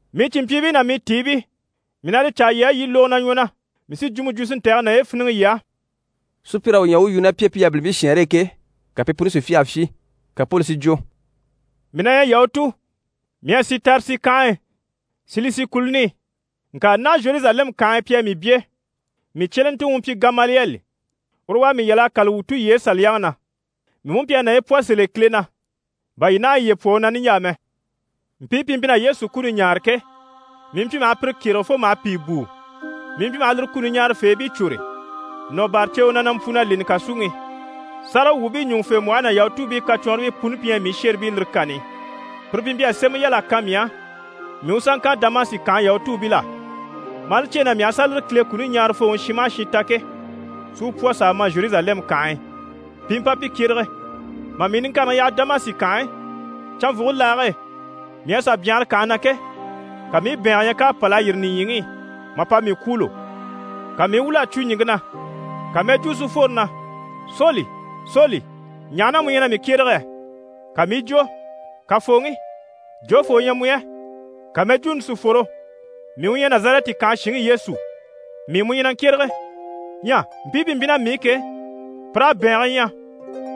«Mii cìnmpyiibii ná mii tiibii, mii na li caa yii á, yii i lógo na ɲwɔ na. Mii sí jwumɔ jwo si ntɛ̀gɛ naye fíniŋɛ yii á.» Sùpyir'à u ɲya u u yu ná pi e pi yabilimpii shɛɛnre e ke, ka pi puni si fyâha fyii, ka Poli si jwo: «Mii na ɲyɛ Yahutu, mii à si Tarisi kànhe e, Silisi kùluni i, ŋka naha a Zheruzalɛmu kànhe e pi à mii byé. Mii cyelentuŋi u mpyi Gamaliyɛli. Uru u à mii yal'a kâla wuu tulyeyi Saliyaŋi na. Mii mú mpyi a naye pwɔ sèl'e Kile na, bà yii naha yiye pwɔ u na niɲjaa mɛ. Mpii pi mpyi na Yesu kuni ɲaare ke, mii mpyi maha pire kyérege fo maha pìi bùu. Mii mpyi maha lire kuni ɲaarafeebii cwôre, nɔ̀ bâra ceewe na, na mpwu na leni kàsuŋi i. Sáragawwuubii ɲùŋufembwɔhe ná Yahutuubii kacwɔnribii puni pi ɲyɛ mii shéribii lire kani i. Pire pi mpyi a sémɛ yal'a kan mii á mii u sà ŋkan Damasi kànhe Yahutuubil'á, maa li cyêe na mii aha sà lire Kile kuni ɲaarafooŋi shin maha shin ta ke, si u pwɔ s'a ma Zheruzalɛmu kànhe e, pi i mpa pi kyérege. Mà mii niŋkareŋi yaha Damasi kànhe e, canvwuge laage e mii à sà byanhara kànhe na ke, ka mii i bɛ̀ɛngɛ ɲya k'à pâl'a yîri nìɲyiŋi i mà pa mii kwûulo. Ka mii i wwûl'a cwo ɲìŋke na, ka mɛjwuu si fworo na “Soli Soli, ɲaha na mu ɲyɛ na mii kyérege yɛ?” Ka mii i jwo “Kafooŋi, jofoo u ɲyɛ mu yɛ?” Ka mɛjwuuni si fworo “Mii u ɲyɛ Nazarɛti kànhe shinŋi Yesu, mii mu ɲyɛ na ŋkyérege.” Ɲyɛ mpii pi mpyi ná mii i ke, pir'à bɛ̀ɛnge ɲya,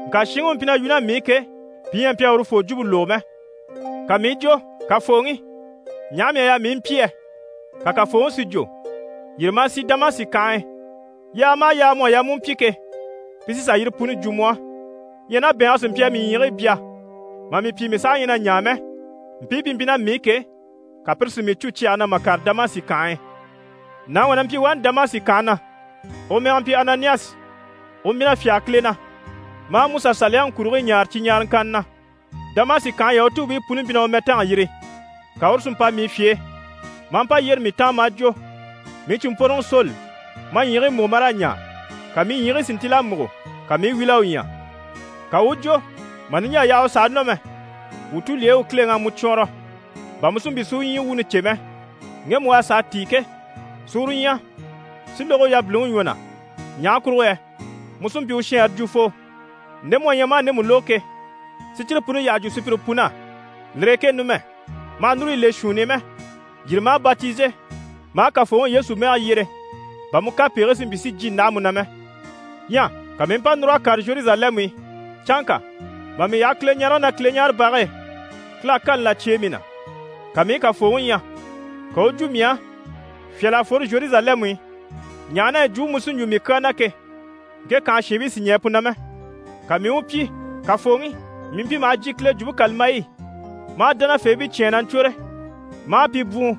ŋka shinŋi u mpyi na yu ná mii i ke, pi ɲyɛ a mpyi a urufoo jwumpe lógo mɛ. Ka mii i jwo “Kafooŋi, ɲaha mii à yaa mii i mpyi yɛ?” Ka Kafooŋi si jwo “Yîri ma a sì Damasi kànhe e, yaaga maha yaaga mu à yaa mu u pyi ke, pi sí sà yire puni jwo mu á.” Ɲyɛ ná bɛ̀ɛnge sí mpyi a mii ɲyiigii bya mà mii pyi mii saha ɲyɛ na ɲaa mɛ, mpii pi mpyi ná mii i ke, ka pire si mii cû na cyɛge na, mà kàre Damasi kànhe e. Nàŋi wà na mpyi wani Damasi kànhe na, u mɛge mpyi Ananiyasi, u mpyi na fyáge Kile na, maa MusaSaliyaŋi kurigii ɲaare cyi ɲaaraŋkanni na. Damasi kànhe Yahutuubii puni mpyi maha u mɛtanga yiri. Ka uru si mpa mii fye e, maa mpa yyére mii taan maa jwo “Mii cìnmpworoŋi Soli, ma ɲyiigii múgo ma raa ɲaa.” Ka mii ɲyiigii si ntíl'a múgo, ka mii i wíl'a u ɲya. Ka u u jwo “Mà niɲjaa yaha u sàha nɔ mɛ, wuu tulyeyi u Kileŋi à mu cwɔɔnrɔ, bà mu si mpyi si u ɲyii wuuni cè mɛ, ŋgemu u a sàa tíi ke, si uru ɲya, si lógo u yabiliŋi ɲwɔ na. Ɲaha kurugo yɛ mu sí n‑pyi u shɛnrɛ jwufoo, nde mu à ɲya maa ndemu lógo ke, si cyire puni yyaha jwo sùpyire pun'á. Lire e ke numɛ ma hà núru yi le shuunni i mɛ, yîri ma a batize, ma a Kafooŋi Yesu mɛge yyere bà mu kapegigii si mpyi si jyé ndáha mu na mɛ.” Ɲyɛ ka mii i mpa núr'a kàre Zheruzalɛmu i. Canŋka mà mii yaha Kileɲarege na Kileɲaarebage e, Kile à kani là cyêe mii na. Ka mii i Kafooŋi ɲya. Ka u u jwo mii á “Fyâl'a fworo Zheruzalɛmu i, ɲaha na yɛ jwumpe mu sí n‑jwo mii kyaa na ke, ŋke kànhe shiinbii sì ɲɛɛ pu na mɛ.” Ka mii i u pyi “Kafooŋi, mii mpyi maha jyè Kile Jwumpe kàlambayi i, maa dánafeebii cyán na ɲcwôre, maa pi bwùun,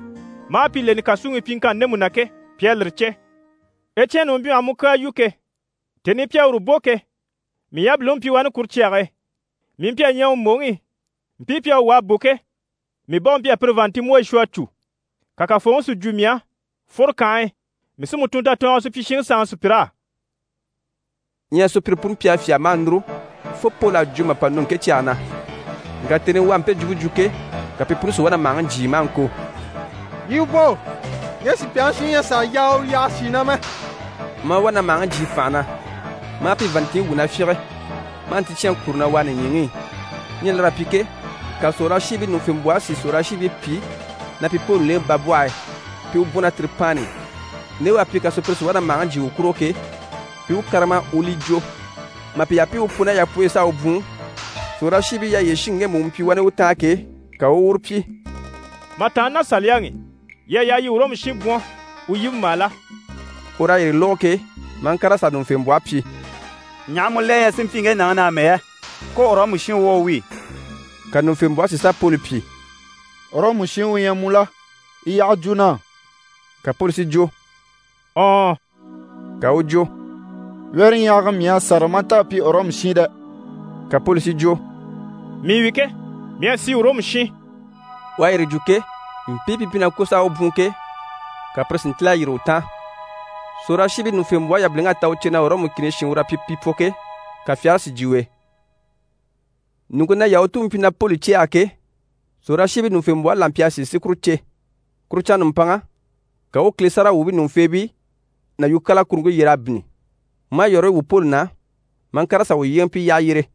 maa pi leni kàsuŋi i pyiŋkanni ndemu na ke, pi à lire cè. Ecyɛni u mpyi maha mu kyaa yu ke, tèni i pi à uru bò ke, mii yabiliŋi mpyi wani kuru cyage e. Mii mpyi a ɲɛɛ u mbòŋi i. Mpii pi à u wà a bò ke, mii bá u mpyi a pire vàanntinmbwoyi shwɔ a cû.” Ka Kafooŋi si jwo mii á “Fworo kànhe e, mii sí mu tun tatɔɔnge e supyishiŋi sanŋi sùpyir'á.”» Ɲyɛ sùpyire puni mpyi a fyâha maa núru fo Poli à jwo mà pa nɔ ŋke cyage na. Ŋka tèni i u à mpe jwumpe jwo ke, ka pi puni si wá na màhaŋi jyii maa ŋko: «Yii u bò, ŋge sùpyaŋi shiŋi ɲyɛ a sàa yaa u yaha shì na mɛ!» Maa wá na màhaŋi jyii fànha na, maa pi vàanntinɲyi wwû na fyínge, maa nticyɛnŋi kure na wàa nìɲyiŋi i. Ɲyɛ lir'à pyi ke, ka sòrolashiibii ɲùŋufembwɔhe si sòrolashiibii pyi na pi Poli lèŋɛ babwɔhe e, pi i u bwɔ̀n ná tiripaanni i, nde u à pyi ka sùpyire si wá na màhaŋi jyii u kurugo ke, pi i u kárama u u li jwo. Mà pi yaha pi i u pwu ná yapwɔyi i s'a u bwùun, sòrolashiibii yyaha yyére shinŋi ŋgemu u mpyi wani u taan ke, ka u u uru pyi: «Mà tàanna ná saliyaŋi i, yii à yaa yii i Ɔrɔmu shin bwɔ̀n u yíbembaa la?» Ur'à yire lógo ke, maa ŋkàr'a sà ɲùŋufembwɔhe pyi: «Ɲaha mu la ɲyɛ si mpyi ŋge nàŋi na amɛ yɛ? Ko Ɔrɔmu shin u wá u wi.» Ka ɲùŋufembwɔhe si sà Poli pyi: «Ɔrɔmu shin u ɲyɛ mu la? Yi yyaha jwo na á.» Ka Poli si jwo: «Ɔɔn.» Ka u u jwo: «Wyɛ́rɛɲyahaga mii à sâra maa nta a pyi Ɔrɔmu shin dɛ!» Ka Poli si jwo: «Mii wi ke, mii à si Ɔrɔmu shin.» U à yire jwo ke, mpii pi mpyi na ŋko s'a u bwùun ke, ka pire si ntíl'a yîri u taan. Sòrolashiibii ɲùŋufembwɔhe yabiliŋ'à ta u cè na Ɔrɔmu kìni shin ur'à pyi pi pwɔ ke, ka fyagare si jyè u e. Ɲùŋke na Yahutuubii mpyi na Poli cɛ̂ɛge ke, sòrolashiibii ɲùŋufembwɔhe la mpyi a sìi si kure cè. Kuru canŋa nùmpanŋa, ka u u Kile sáragawwuubii ɲùŋufeebii ná yukyaala kuruŋke yyer'a bínni, maa yɔ̀rɔyi wwû Poli na, maa ŋkàr'a sà u yyéeŋɛ pi yyaha yyére.